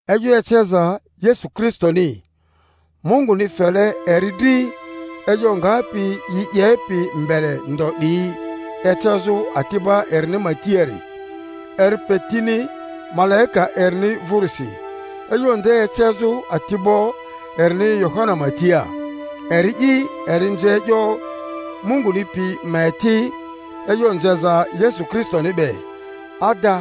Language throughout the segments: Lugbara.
E'yo eceza Yesu Kristoni, Munguni fele eri dri e'yo ngapi yi 'yepi mbele ndo 'diyi ecezᴜ ati'ba erini ma tiari; eri pe tini malaika erini vᴜrisi, e'yo nde ecezᴜ ati'bo erini Yohana ma tia; eri'i eri nze e'yo Munguni pi ma eti, e'yo nzeza Yesu Kristoni be, ada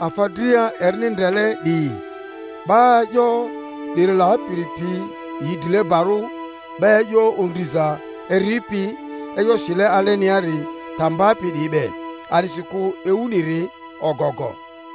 afa dria erini ndrele 'diyi. 'Ba e'yo 'diri lapiri pi yi drilebarᴜ, 'ba e'yo ondriza eripi, e'yo sile aleniari ta mbapi 'diyi be; a'disikᴜ ewuniri ogogo.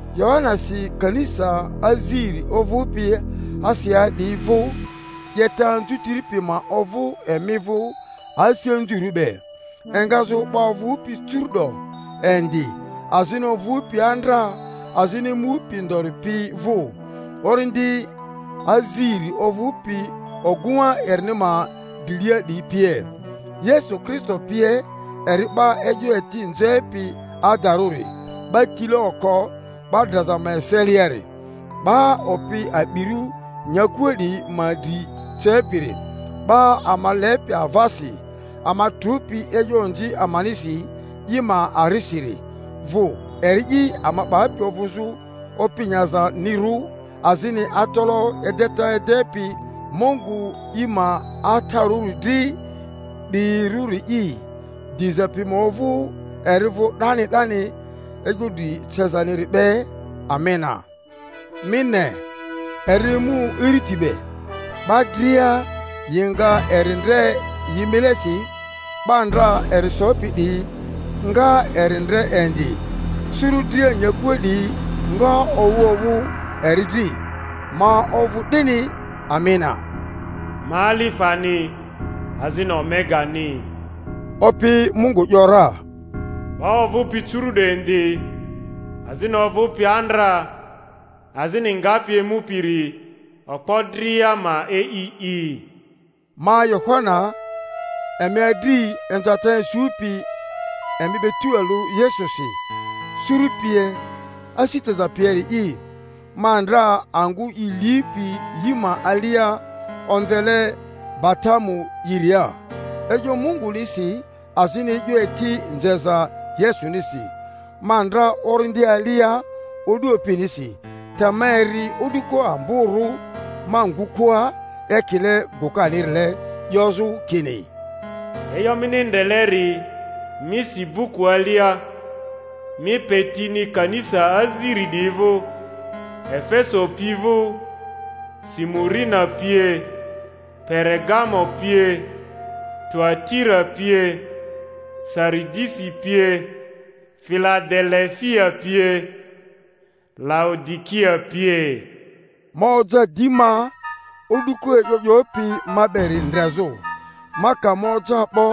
Yohana si kanisa aziri ovᴜpi Asiaa 'diyi vᴜ: 'Yeta anzutiri pi ma ovᴜ emi vᴜ asi anzurᴜ be, engazᴜ 'ba ovᴜpi curu'do indi, azini ovᴜpi andra, azini emupi ndori pi vᴜ, orindi azIri ovᴜpi ogᴜŋa erini ma drilia 'diyi pie, Yesu Kristo pie, eri 'ba e'yo eti nzepi adarᴜri, 'ba tile oko 'ba draza ma eseliari, 'ba opi a'birᴜ nyakua 'diyi ma dri cepiri. 'Ba ama lepi avasi, ama trᴜpi e'yo onzi amanisi i ma arisiri vᴜ; eri'i ama 'bapi ovᴜzᴜ opi nyazanirᴜ azini atalaᴜ edeta edepi Mungu i ma Atarᴜri dri 'diyirᴜri'i; diza pi ma ovᴜ eri vᴜ 'dani 'dani e'yo dri cezaniri be. Amena. Mi ne, eri emu iriti be; 'ba dria yi nga eri ndre yi milesi, 'ba ndra eri sopi 'diyi nga eri ndre indi; suru dria nyakua 'diyi nga owᴜ owᴜ eri dri. Ma ovᴜ 'dini. Amena. Ma Alifani azini Omegani, Opi Mungu ‘yora, 'ba ovᴜpi curu'do indi, azini ovᴜpi andra, azini ngapi emupiri, okpo dria ma e'i'i. Ma Yohana, emi adri, inzata isupi emi be tualᴜ Yesusi, suru pie, asi teza pieri'i, ma ndra angᴜ i lipi yi ma alia omvele Patamo'iria, e'yo Mungunisi azini e'yo eti nzeza Yesunisi. Ma ndra Orindi alia o'du Opinisi, te ma eri o'duko amborᴜ ma ngᴜkᴜa, ekile gᴜkanirile 'yozᴜ kini, E'yo mini ndreleri mi si buku alia, mi pe tini kanisa aziri 'diyi vᴜ; Efeso pi vᴜ, Simurina pie, Peregamo pie, Tuatira pie, Saridisi pie, Filadelefia pie, Laodikia pie. Ma oja di ma, o'duko e'yo 'yopi ma beri ndrezᴜ. Ma ka ma oja 'bo,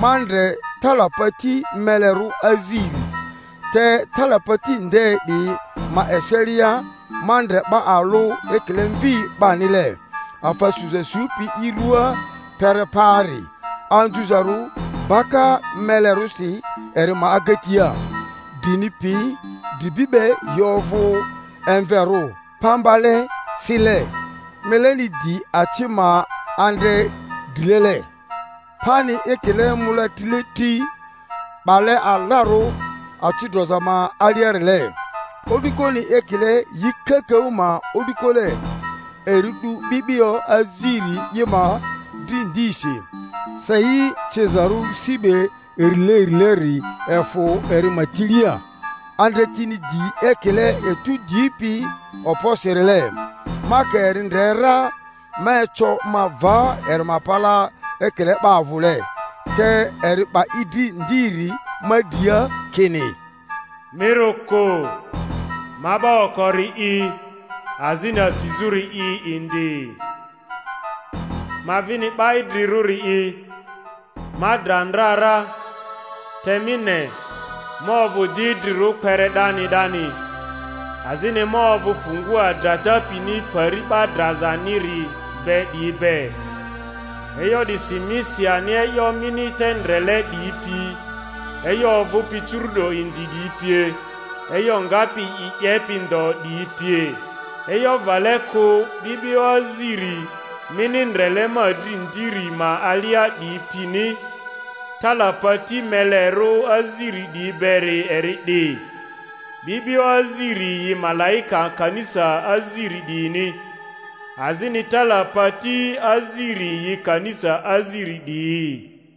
ma ndre talapati melerᴜ aziri, te talapati nde 'diyi ma eselia ma ndre 'ba alᴜ ekile Mvi 'banile, afa suza supi i ruaa kpere paari, anzuzarᴜ baka melerᴜsi eri ma agatia. Drini pi dribi be yi ovᴜ emverᴜ pambale, sile; mileni di aci ma andre drilele, pani ekile mola trile tri 'bale alarᴜ aci droza ma aliarile, o'dukoni ekile yi kakaᴜ ma o'dukole. Eri 'du 'bi'bio aziri i ma dri ndisi; sei cizarᴜ si be irileirileri efᴜ eri ma tilia; andretini di ekile etu dipi okposirile. Ma ka eri ndre ra, ma eco ma va eri ma palaa ekile 'ba avᴜle. Te eri 'ba i dri ndiri ma dria, kini, Mi rᴜ kᴜ, ma 'ba okori'i azini asizᴜri'i indi, ma vini 'ba Idrirᴜri'i; ma dra ndra ra, te mi ne, ma ovᴜ di idrirᴜ kpere 'dani 'dani, azini ma ovᴜ fungua drata pini Pari 'ba drazaniri be 'diyi be. E'yo 'disi mi si ani e'yo mini te ndrele 'diyi pi, e'yo ovᴜpi curu'do indi 'diyi pie, e'yo ngapi yi 'yepi ndo 'diyi pie. E'yo vale kᴜ 'bi'bio aziri mini ndrele ma dri ndiri ma alia 'diyi pini, talapati melerᴜ aziri 'diyi beri eri 'di: 'bi'bio aziri yi malaika kanisa aziri 'diyini, azini talapati aziri yi kanisa aziri 'diyi.